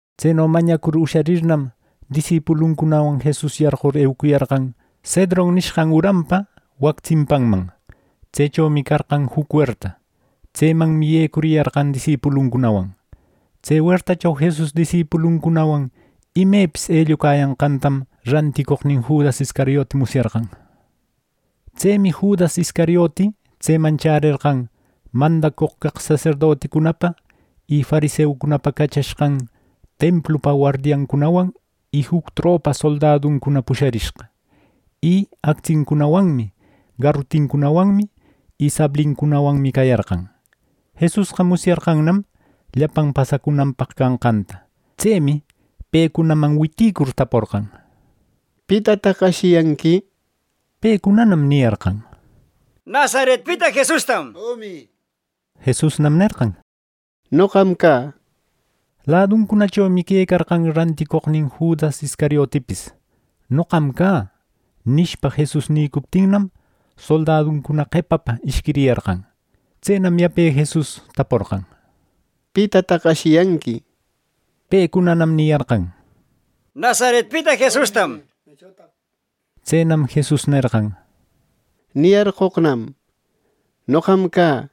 Tseno mañacur usharirnam, disipuluncunawan Jesus yarqur eucuyarqan Cedron nishqan uranpa wac tsimpanman. Tsechomi carqan juc werta. Tsemanmi yecuriyarqan disipuluncunawan. Tse wertacho Jesus disipuluncunawan imepis ellucayanqantam ranticoqnin Judas Iscariote musyarqan. Tsemi Judas Iscariote tseman chärerqan mandacoq caq saserdoticunapa y fariseucunapa cachashqan templupa wardiancunawan y juc tropa soldaduncuna pusharishqa. Y actsincunawanmi, garutincunawanmi y sablincunawanmi cayarqan. Jesusqa musyarqannam llapan pasacunanpaq canqanta. Tsemi pecunaman witicur taporqan: —¿Pitataq ashiyanqui? —nir. Pecunanam niyarqan: —Nazaretpita Jesustam —nir. Jesusnam nerqan: —Noqam cä —nir. Laduncunachomi quecarqan ranticoqnin Judas Iscariotipis. “Noqam cä” nishpa, Jesus nïcuptinnam, soldaducuna qepapa ishquiriyarqan. Tsenam yape Jesus taporqan: —¿Pitataq ashiyanqui? —nir. Pecunanam niyarqan: —Nazaretpita Jesustam —nir. Tsenam Jesus nerqan: —Niyarqoqnam: Noqam cä.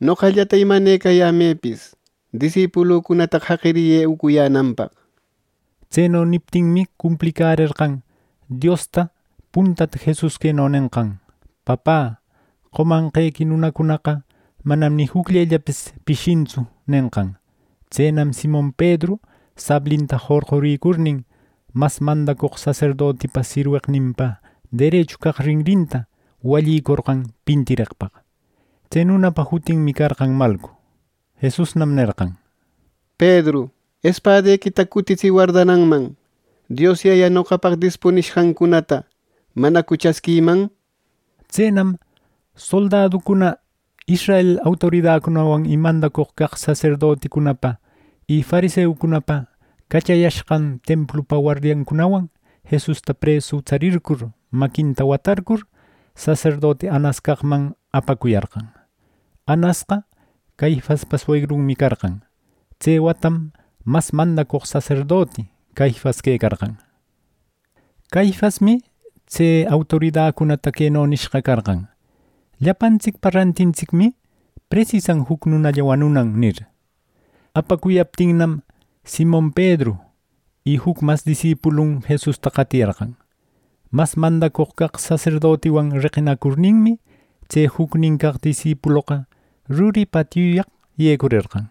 Noqallata imanecayämëpis, disipulucunataqa jaqiriyë eucuyänanpaq —nir. Tseno niptinmi, cumplicärerqan Diosta puntata Jesus queno nenqan: “Papä, qomanqequi nunacunaqa manam ni jucllellapis pishintsu” nenqan. Tsenam Simon Pedru sablinta jorquricurnin, mas mandacoq saserdotipa sirweqninpa derechu caq rinrinta wallicorqan pintireqpaq. Tse nunapa jutinmi carqan Malcu. Jesusnam nerqan: —¡Pedru espadequita cutitsï wardananman! Dios Yaya noqapaq dispunishqancunata ¿manacu chasquïman! —nir. Tsenam soldaducuna israel autoridacunawan y mandacoq caq saserdoticunapa y fariseucunapa cachayashqan templupa wardiancunawan Jesusta presu tsarircur, maquinta watarcur, saserdoti Anas caqman apacuyarqan. Anasqa Caifaspa suegrunmi carqan. Tse watam mas mandacoq saserdoti Caifas quecarqan. Caifasmi tse autoridacunata queno nishqa carqan: “Llapantsicpa rantintsicmi presisan juc nunalla wanunan” nir. ˻Apacuyaptinnam˼ Simon Pedru y juc mas disipulun Jesusta qatiyarqan. Mas mandacoq caq saserdotiwan reqinacurninmi, tse jucnin caq disipuloqa ruri patiuyaq yecurerqan.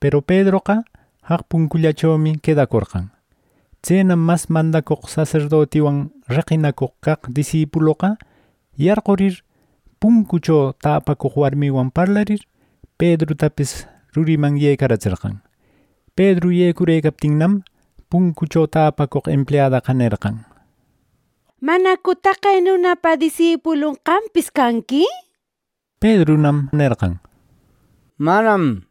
Peru Pedroqa jaq puncullachomi quedacorqan. Tsenam mas mandacoq saserdotiwan reqinacoq caq disipuloqa yarqurir, puncucho täpacoq warmiwan parlarir, Pedrutapis ruriman yecaratserqan. Pedru yecurëcaptinnam, puncucho tapacoq empleadaqa nerqan: —¿Manacu taqe nunapa disipulun qampis canqui? —nir. Pedrunam: —¡Manam! —nerqan.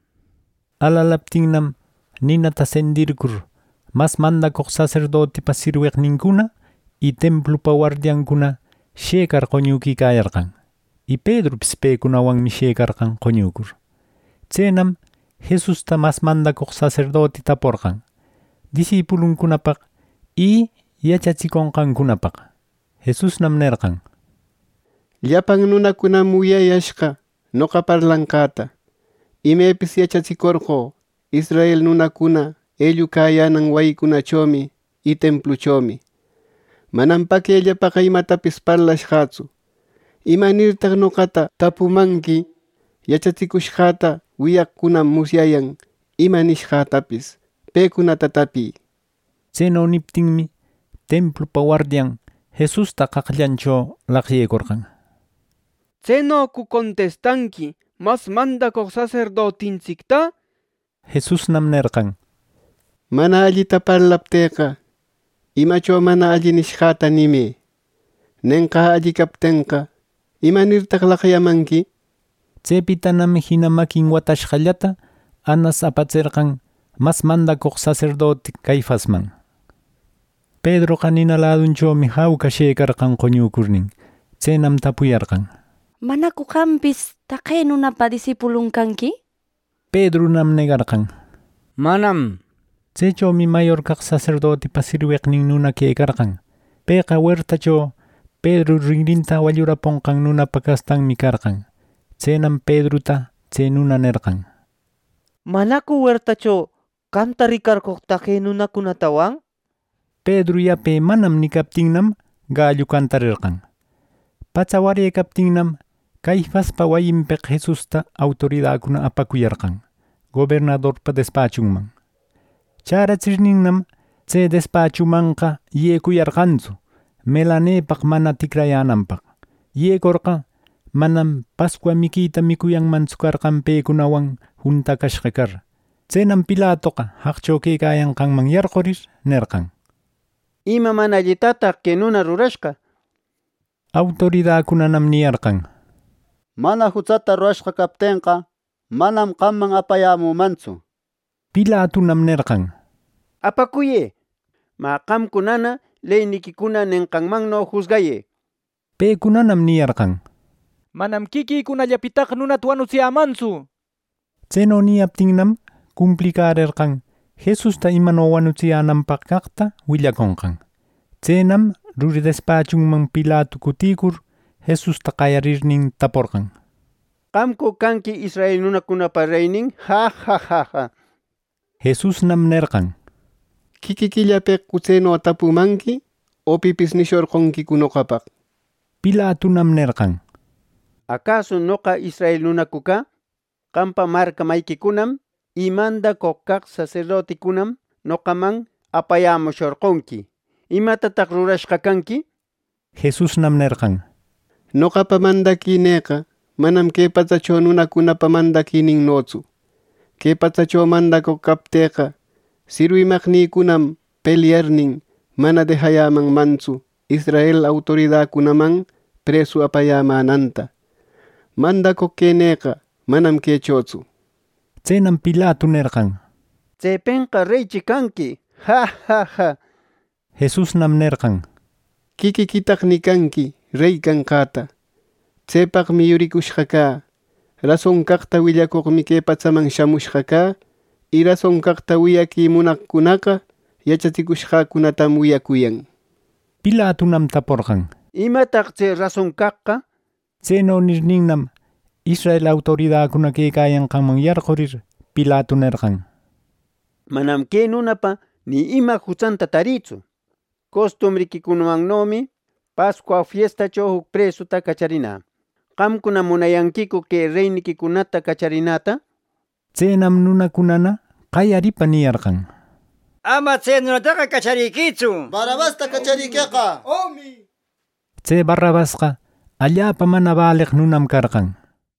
Alalaptinnam, ninata sendircur, mas mandacoq saserdotipa sirweqnincuna y templupa wardiancuna shëcar qoñuquicayarqan, y Pedrupis pecunawanmi sharëcarqan qoñucur. Tsenam Jesusta mas mandacoq saserdoti taporqan disipuluncunapaq y yachatsiconqancunapaq. Jesusnam nerqan: —Llapan nunacunam wiyayashqa noqa parlanqäta. Imepis yachatsicorqö israel nunacuna ellucayänan wayicunachomi y templuchomi. Manam paquellapaqa imatapis parlashqätsu. ¿Imanirtaq noqata tapumanqui? Yachatsicushqäta wiyaqcunam musyayan ima nishqätapis. ¡Pecunata tapï! —nir. Tseno niptinmi templupa wardian Jesusta qaqllancho laqyecorqan, —¿Tsenocu contistanqui mas mandacoq saserdotintsicta! —nir. Jesusnam nerqan: —Mana allita parlaptïqa, imacho mana alli nishqäta nimë. Nenqä alli captenqa, ¿imanirtaq laqyamanqui? —nir. Tsepitanam jina maquin watashqallata Anas apatserqan mas mandacoq saserdoti Caifasman. Pedroqa nina ladunchomi jauca shëcarqan qoñucurnin. Tsenam tapuyarqan: —¿Manacu qampis taqe nunapa disipulun canqui? —nir. Pedrunam negarqan: —Manam —nishpa. Tsechomi mayor caq saserdotipa sirweqnin nuna quecarqan. Pëqa wertacho Pedru rinrinta walluraponqan nunapa castanmi carqan. Tsenam Pedruta tse nuna nerqan: —¿Manacu wertacho qamta ricarqoq taqe nunatawan? —nir. Pedru yape “Manam” nicaptinnam, gallu cantarerqan. Patsa warärëcaptinnam, Caifaspa wayinpeq Jesusta autoridacuna apacuyarqan gobernadorpa despachunman. Chäratsirninnam, tse despachunmanqa yecuyarqantsu melanepaq mana ticrayänanpaq. Yecorqa, manam Pascua miquita micuyanmantsu carqan pecunawan juntacushqa car. Tsenam Pilatoqa jaqcho quecayanqanman yarqurir, nerqan: —¿Ima mana allitataq que nuna rurashqa? —nir. Autoridacunanam niyarqan: —Mana jutsata rurashqa captenqa, manam qamman apayämümantsu —nir. Pilatunam nerqan: —Apacuyë. Mä qamcunana leyniquicuna nenqanmanno jusgayë —nir. Pecunanam niyarqan: —Manam quiquïcunallapitaqa nunata wanutsiyämantsu. Tseno niyaptinnam, cumplicärerqan Jesus imano wanutsiyänanpaq caqta willaconqan. Tsenam ruri despachunman Pilatu cuticur Jesusta qayarirnin taporqan: —¿Qamcu canqui israel nunacunapa reynin? —nir. Jesusnam nerqan: —¿Quiquiquillapeqcu tseno tapumanqui, o pipis nishorqonquicu noqapaq? —nir. Pilatunam nerqan: —¿Acasu noqa israel nunacu cä! Qampa marca mayiquicunam y mandacoq caq saserdoticunam noqaman apayämushorqonqui. ¿Imatataq rurashqa canqui? —nir. Jesusnam nerqan: —Noqapa mandaquinïqa manam que patsacho nunacunapa mandaquininnotsu. Que patsacho mandacoq captïqa, sirwimaqnïcunam pelyarnin, mana dejayämanmantsu israel autoridacunaman presu apayämänanta. Mandacoq quenïqa manam quechotsu —nir. Tsenam Pilatu nerqan: —¿Tsepenqa reychi canqui? —nir. Jesusnam nerqan: —Quiquiquitaq nicanqui rey canqäta. Tsepaqmi yuricushqa cä. Rason caqta willacoqmi que patsaman shamushqa cä. Y rason caqta wiyaqui munaqcunaqa yachatsicushqäcunatam wiyacuyan —nir. Pilatunam taporqan: —¿Imataq tse rason caqqa! —nir. Tseno nirninnam, israel autoridacuna quecayanqanman yarqurir, Pilatu nerqan: —Manam que nunapa ni ima jutsanta tarïtsu. Costumbriquicunamannomi Pascua fiestacho juc presuta cacharinä. ¿Qamcuna munayanquicu que reyniquicunata cacharinäta? —nir. Tsenam nunacunana qayaripa niyarqan: —¡Ama tse nunataqa cacharïtsu! ¡Barrabasta cachariqueqa! —nir. Tse Barrabasqa allapa mana baleq nunam carqan.